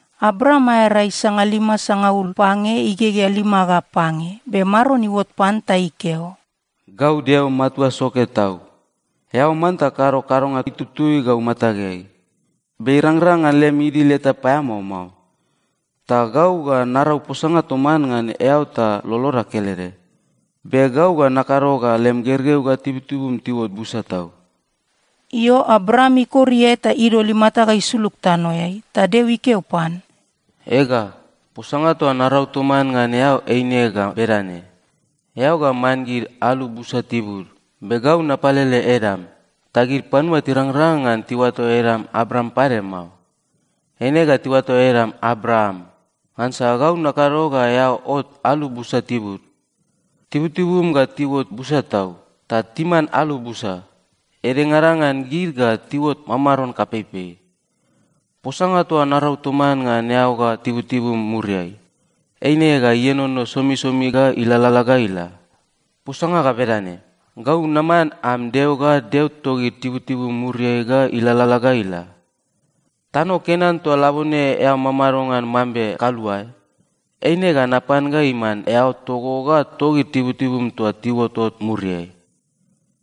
Abram aea rai sangalima sangaul pange igegea lima ga pange, be Maron iuot pan ta ikeo, “Gau Deo Matua Soke Tau. Eao manta kado kadonga itutui gau matageai, be irangrang ngan lem idil eta paeamao mao. Ta gau ga narau posanga toman ngan eao ta loloda kelede. Be gau ga nakado ga lem gergeu ga tibutibum tiuot busa tau.” Io, Abram ikor iae ta idol imata ga isulug tanoeai, ta Deo ikeo pan, “Ega, posanga toa narau toman ngan eao eine ga bedane: Eao ga man gid alu busa tibud. Be gau napalele edam. Ta gid panua tirangrang ngan tiuato edam Abram pade mao. Eine ga tiuato edam Abraam, ngansa gau nakado ga eao ot alu busa tibud. Tibutibum ga tiuot busa tau, ta timan alu busa. Edengada ngan gid ga tiuot mamaron kapeipei. Posanga toa narau toman ngan eao ga tibutibum muriai, eine ga ienono somisomi ga ilalala ga ila. Posanga ga bedane: Gau naman am Deo ga Deo togid tibutibum muriai ga ilalala ga ila. Tano Kenan toa labone eao mamado ngan mambe kaluae, eine ga napan ga iman eao togo ga togid tibutibum toa tiuotot muriai.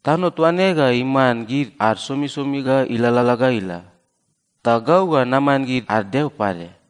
Tano toa ne ga iman gid ad somisomi ga ilalala ga ila. Ta gau ga naman gid ad Deo pade.”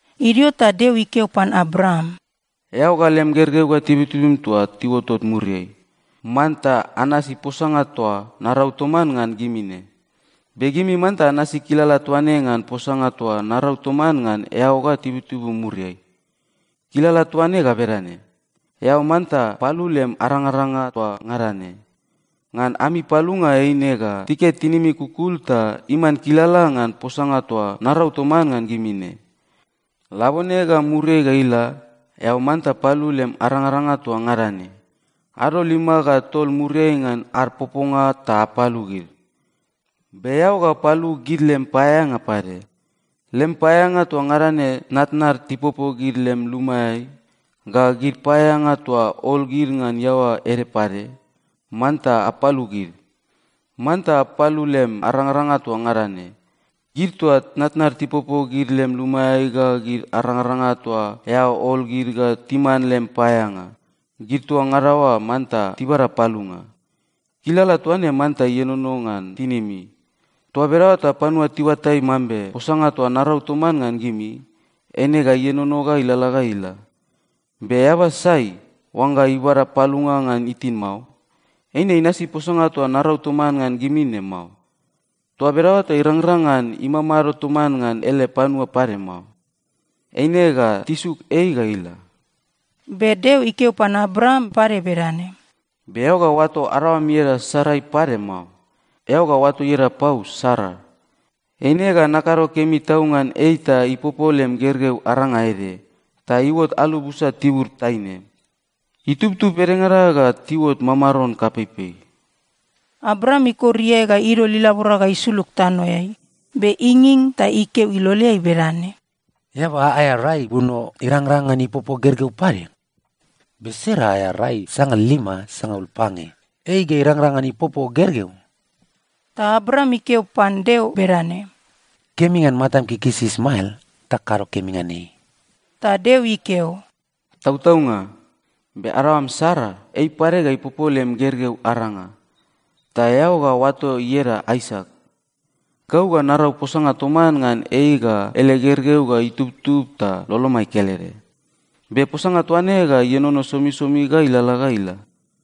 Idio ta Deo ikeo pan Abraam, “Eao ga lem gergeu ga tibutibum toa tiuotot muriai, manta anasi posanga toa narau toman ngan gimi ne. Be gimi manta anasi kilala toa ne ngan posanga toa narau toman ngan eao ga tibutibum muriai. Kilala toa ne ga bedane: Eao manta palu lem arangaranga toa ngada ne. Ngan ami palunga eine ga tiket tinimi kukul ta iman kilala ngan posanga toa narau toman ngan gimi ne. Labone ga muriai ga ila, eao manta palu lem arangaranga toa ngada ne. Ado lima ga tol muriai ngan ad poponga ta apalu gid. Be eao ga palu gid lem paeaeanga pade. Lem paeaeanga toa ngada ne tnatnad tipopo gid lem lumaeai, ga gid paeaeanga toa ol gid ngan iaoa ede pade, manta apalu gid. Manta palu lem arangaranga toa ngada ne. Gid toa tnatnad tipopo gid lem lumaeai ga gid arangaranga toa eao ol gid ga timan lem paeaeanga, gid toa ngada oa manta tibada palunga. Kilala toa ne manta ienono ngan tinimi. Toa bedaoa ta panua tiuatai mambe posanga toa narau toman ngan gimi, eine ga ienono ga ilalala ga ila. Be eaba sai, oangga ibada palunga ngan itin mao, eine inasi posanga toa narau toman ngan gimi ne mao. Toa bedaoa ta irangrang ngan imamado toman ngan ele panua pade mao. Eine ga tisuk ei ga ila.” Be Deo ikeo pan Abraam pade bedane, “Be eao ga oato adaoam ieda Sarai pade mao. Eao ga oato ieda pau Sara. Eine ga nakado kemi tau ngan ei ta ipopo lem gergeu aranga ede, ta iuot alu busa tibud taine. Itubtub edengada ga tiuot mamaron kapeipei.” Abraam ikor iae ga idol ilabora ga isulug tanoeai, be inging ta ikeo iloleai bedane, “Eaba aea rai buno irangrang ngan ipopo gergeu pade? Be Sara aea rai sangalima sangaul pange. Ei ga irangrang ngan ipopo gergeu?” Ta Abraam ikeo pan Deo bedane, “Kemi ngan matam ikikisi Ismael ta kado kemi ngan ei.” Ta Deo ikeo, “Tautaunga. Be adaoam Sara, ei pade ga ipopo lem gergeu aranga, ta eao ga oato ieda Aisak. Gau ga narau posanga toman ngan ei ga ele gergeu ga itubtub ta lolomai kelede. Be posanga toa ne ga ienono somisomi ga ilalala ga ila.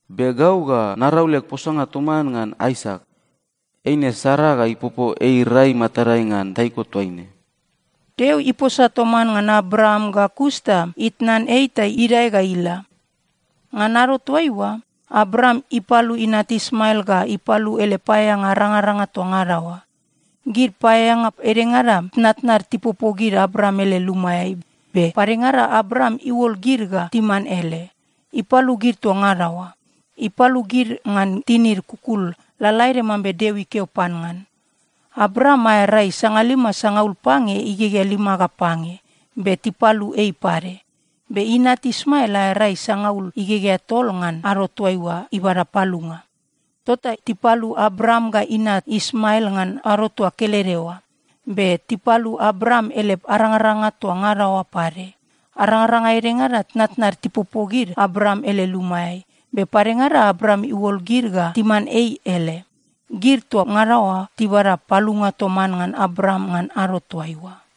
Be gau ga narau leg posanga toman ngan Aisak. Eine Sara ga ipopo ei rai matadai ngan taiko toaine.” Deo iposa toman ngan Abraam ga kus ta itnan ei ta idae ga ila. Ngan ado toaiua, Abraam ipalu inat Ismael ga ipalu ele paeaeanga arangaranga toa ngada oa. Gid paeaeanga edengada tnatnad tipopo gid Abraam ele lumaeai, be padengada Abraam iuol gid ga timan ele, ipalu gid toa ngada oa. Ipalu gid ngan tinid kukul lalaede mambe Deo ikeo pan ngan. Abraam aea rai sangalima sangaul pange igegea lima ga pange, be tipalu ei pade. Be inat Ismael aea rai sangaul igegea tol ngan ado toaiua ibada palunga. Tota tipalu Abraam ga inat Ismael ngan ado toa kelede oa. Be tipalu Abraam ele arangaranga toa ngada oa pade. Arangaranga edengada tnatnad tipopo gid Abraam ele lumaeai, be padengada Abraam iuol gid ga timan ei ele, gid toa ngada oa tibada palunga toman ngan Abraam ngan ado toaiua.